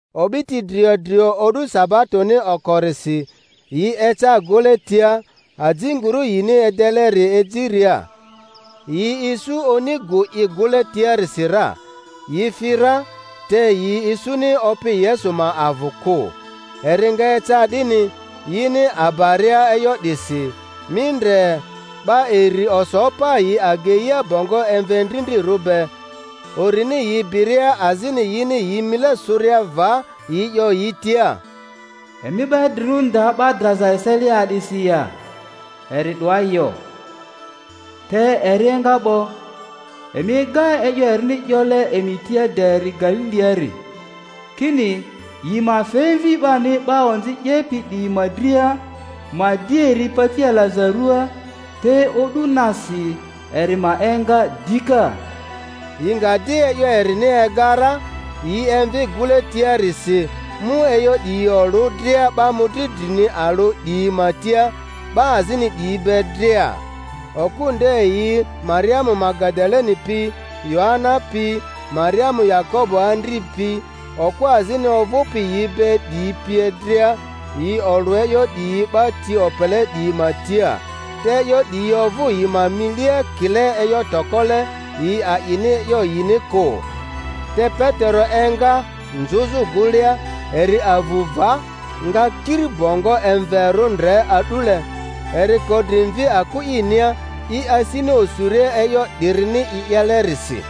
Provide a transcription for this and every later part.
O'biti drio drio o'du sabatoni okorisi, yi eca gᴜle tia, ajinguru yini edeleri ejiria. Yi isu oni gᴜ i gᴜle tiarisi ra. Yi fi ra, te yi isuni Opi Yesu ma avᴜ kᴜ. Eri nga eca 'dini, yini abaria e'yo 'disi, mi ndre, 'ba iri oso pa yi ageia bongo emve ndrindrirᴜ be; urini yi biria azini yini yi mile sᴜria va, yi 'yo yi tia, Emi 'ba idrirᴜri nda 'ba draza eselia a'disi ya? Eri 'doa yo, te eri enga 'bo; emi ega e'yo erini 'yole emi tia de eri Galiliari, kini yi ma fe Mvi 'bani 'ba onzi 'yepi 'diyi ma dria, ma di eri pati alaza ruaa, te o'du nasi eri ma enga dika. Yi nga di e'yo erini ega ra, yi emvi gᴜle tiarisi, mu e'yo 'diyi olᴜ dria 'ba mᴜdri drini alᴜ 'diyi ma tia, 'ba azini 'diyi be dria. Okᴜ nde yi Mariamu Magadaleni pi, Yoana pi, Mariamu Yakobo andri pi, okᴜ azini ovᴜpi yi be 'diyi pie dria, yi olᴜ e'yo 'diyi 'ba ti opele 'diyi ma tia; te e'yo 'diyi ovᴜ yi ma milia kile e'yo tokole, yi a'ini e'yo yini kᴜ. Te Petero enga, nzᴜzᴜ gᴜlea; eri avu va, nga kiri bongo emverᴜ ndre a'dule; eri ko dri mvi aku inia, i asini osuria e'yo 'dirini i 'yelerisi.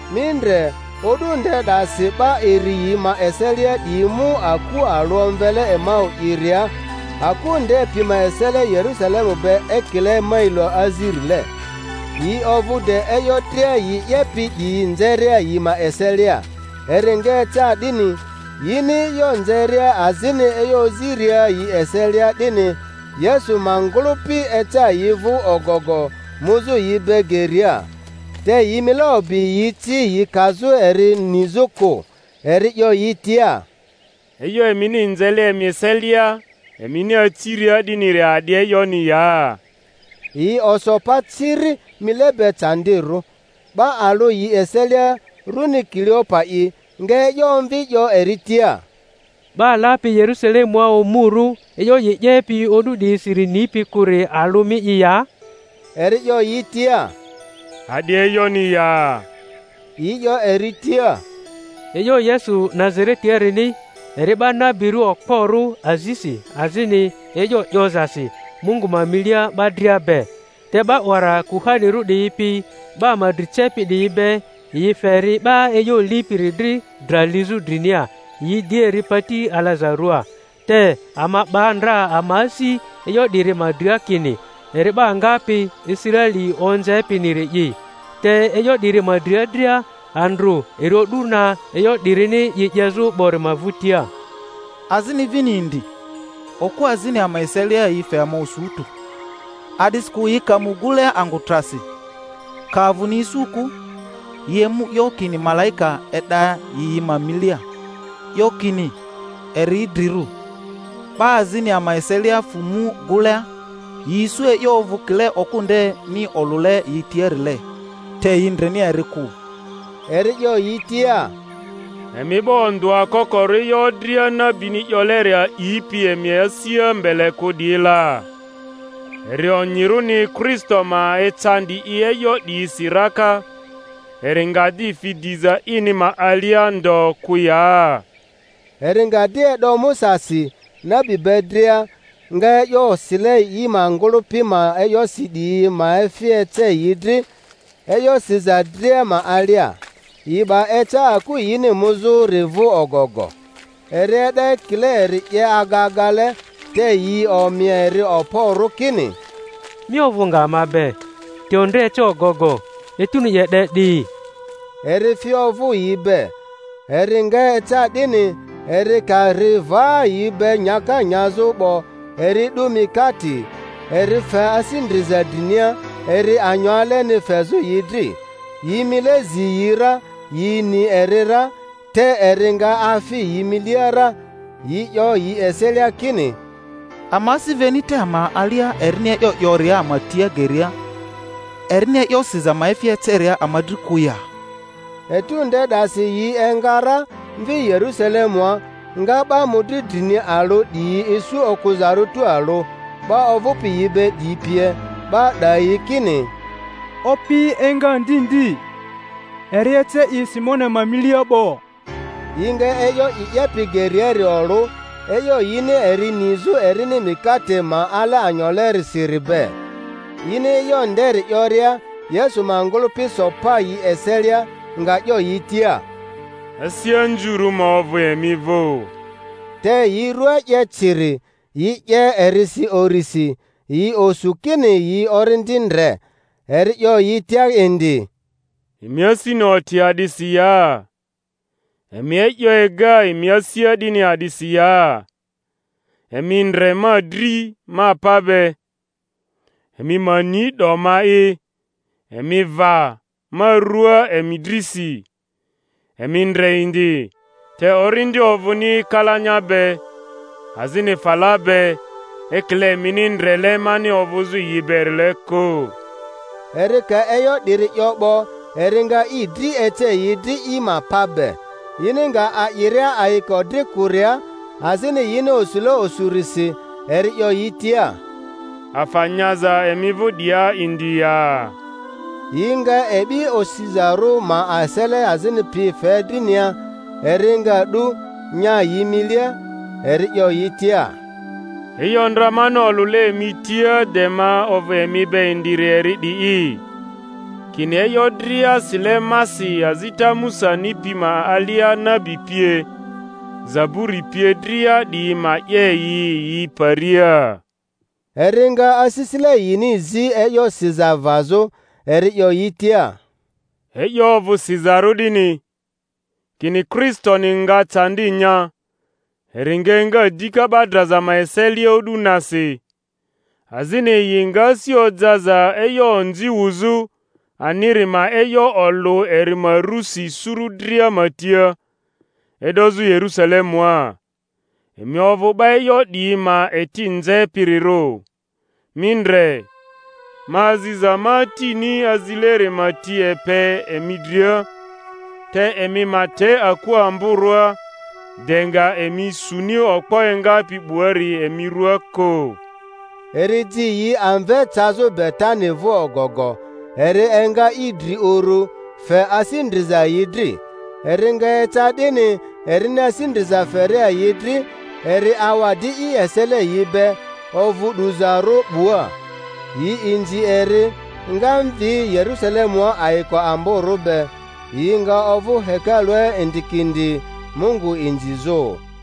Mi ndre, o'du nde 'dasi 'ba iri yi ma eselia 'diyi mu aku alᴜ omvele Emau'iria, aku nde pi ma esele Yerusalemu be ekile mailo azirile. Yi ovᴜ de e'yo dria yi 'yepi 'diyi nzeria yi ma eselia. Eri nga eca 'dini, yini e'yo nzeria azini e'yo oziria yi eselia 'dini, Yesu ma ngᴜlᴜpi eca yi vᴜ ogogo, muzᴜ yi be geria. Te yi mile obi yi ci yi kazᴜ eri nizᴜ kᴜ. Eri 'yo yi tia, E'yo emini nzele emi eselia emini aciria 'diniri a'di e'yoni ya? Yi oso pa ciri, mile be candirᴜ. 'Ba alᴜ yi eselia, runi Kiliopa'i, nga e'yo omvi 'yo eri tia, 'Ba lapi Yerusalemua omurᴜ e'yo i 'yepi o'du 'diyisiri nipi kᴜri alᴜ mi'i ya? Eri 'yo yi tia, A'di e'yoni ya? Yi 'yo eri tia, E'yo Yesu Nazaretiarini, eri 'ba nabirᴜ okporᴜ azisi azini e'yo 'yozasi Mungu ma milia 'ba dria be, te 'ba 'wara kuhanirᴜ 'diyi pi 'ba ama dri cepi 'diyi be, yi fe eri 'ba e'yo lipiri dri dra lizᴜ drinia, yi di eri pati alaza ruaa. Te ama 'ba ndra ama asi e'yo 'diri ma dria, kini, eri 'ba ngapi Israeli onzepiniri'i. Te e'yo 'diri ma dria dria, andrᴜ eri o'du na e'yo 'dirini i 'yezᴜ 'bori ma vᴜtia. Azini vini indi, okᴜ azini ama eselia yi fe ama osu tᴜ, a'disikᴜ yi ka mu gᴜlea angᴜ trasi, ka avᴜni isu kᴜ, yi emu 'yo kini malaika e'da yi yi ma milia, 'yo kini eri idrirᴜ. 'Ba azini ama eselia fᴜ mu gᴜlea, yi isu e'yo ovᴜ kile okᴜ ndeni olᴜle yi tiarile; te yi ndreni eri kᴜ. Eri 'yo yi tia, Emi 'ba ondᴜa kokorᴜ e'yo dria nabini 'yoleri a'ipi emi asia mbele kᴜ 'diyi la! Eri onyirᴜni Kristo ma ecandi i e'yo 'diyisi raka, eri nga di fi diza ini ma alia ndo kᴜ ya? Eri nga di e'do Musasi, nabi be dria, nga e'yo sile i ma ngᴜlᴜpi ma e'yosi 'diyi ma efi ece yi dri, e'yo siza dria ma alia. Yi 'ba eca aku yini muzᴜri vᴜ ogogo. Eri e'da ekile eri 'ye aga agale, te yi omi eri okporᴜ kini, Mi ovᴜ nga ama be, te ondre eca ogogo, etuni 'ye 'de 'di. Eri fi ovᴜ yi be. Eri nga eca 'dini, eri ka ri va yi be nyaka nyazᴜ 'bo, eri 'du mikate, eri fe asi ndriza drinia, eri anyo aleni fezᴜ yi dri. Yi mile zi yi ra, yi ni eri ra; te eri nga afi yi milia ra. Yi 'yo yi eselia kini, Ama asi veni te ama alia erini e'yo 'yoria ama tia geria, erini e'yo siza ma efi eceria ama dri kᴜ ya? Etu nde 'dasi yi enga ra, mvi Yerusalemᴜa, nga 'ba mᴜdri drini alᴜ 'diyi isu okᴜzarᴜ tualᴜ, 'ba ovᴜpi yi be 'diyi pie; 'ba 'dayi kini, Opi enga ndi ndi, eri ece i Simoni ma milia 'bo! Yi nga e'yo i 'yepi geriari olᴜ, e'yo yini eri nizᴜ erini mikate ma ale anyolerisiri be. Yini e'yo nderi 'yoria, Yesu ma ngᴜlᴜpi so pa yi eselia, nga 'yo yi tia, Asi anzurᴜ ma ovᴜ emi vᴜ! Te yi rua 'ye ciri, yi 'ye erisi urisi, yi osu kini yi orindi ndre. Eri 'yo yi tia indi, Emi asini oti a'disi ya? Emi e'yo ega emi asia 'dini a'disi ya? Emi ndre ma dri ma pa be, emi ma ni 'do ma'i; emi va ma rua emi drisi, emi ndre indi; te orindi ovᴜni kalanya be, azini fala be, ekile emini ndrele mani ovᴜzᴜ yi berile kᴜ. Eri ka e'yo 'diri 'yo 'bo, eri nga i dri ece yi dri i ma pa be. Yini nga a'iria ayiko dri kᴜria, azini yini osule osurisi, eri 'yo yi tia, Afa nyaza emi vᴜ 'dia indi ya? Yi nga e'bi osizarᴜ ma esele azini pi fe drinia, eri nga 'du, nya yi milia. Eri 'yo yi tia, E'yo ndra mani olᴜle emi tia de ma ovᴜ emi be indiri eri 'di'i, kini e'yo dria sile masi azita Musani pi ma alia nabi pie, zaburi pie dria 'diyi ma 'ye yi yi paria. Eri nga asisile yini zi e'yo siza vazᴜ, eri 'yo yi tia, E'yo ovᴜ sizarᴜ 'dini, kini Kristoni nga candi nya, eri nga enga dika 'ba draza ma eselia o'du nasi, azini yi nga asi ojaza e'yo onzi wuzᴜ aniri ma e'yo olᴜ eri ma rusi suru dria ma tia, e'dozᴜ Yerusalemua. Emi ovᴜ 'ba e'yo 'diyi ma eti nzepirirᴜ. Mi ndre, ma aziza ma Atini azileri ma ti epe emi dria; te emi ma te aku amborᴜa de nga emi suni okpo engapi 'buari emi ruaa kᴜ. Eri ji yi amve cazᴜ Betani vᴜ ogogo; eri enga i dri uru, fe asi ndriza yi dri. Eri nga eca 'dini, erini asi ndriza feria yi dri, eri awa di i esele yi be, ovᴜ 'duzarᴜ 'bua. Yi inzi eri, nga mvi Yerusalemua ayiko amborᴜ be; yi nga ovᴜ hekalua indikindi Mungu inzizᴜ.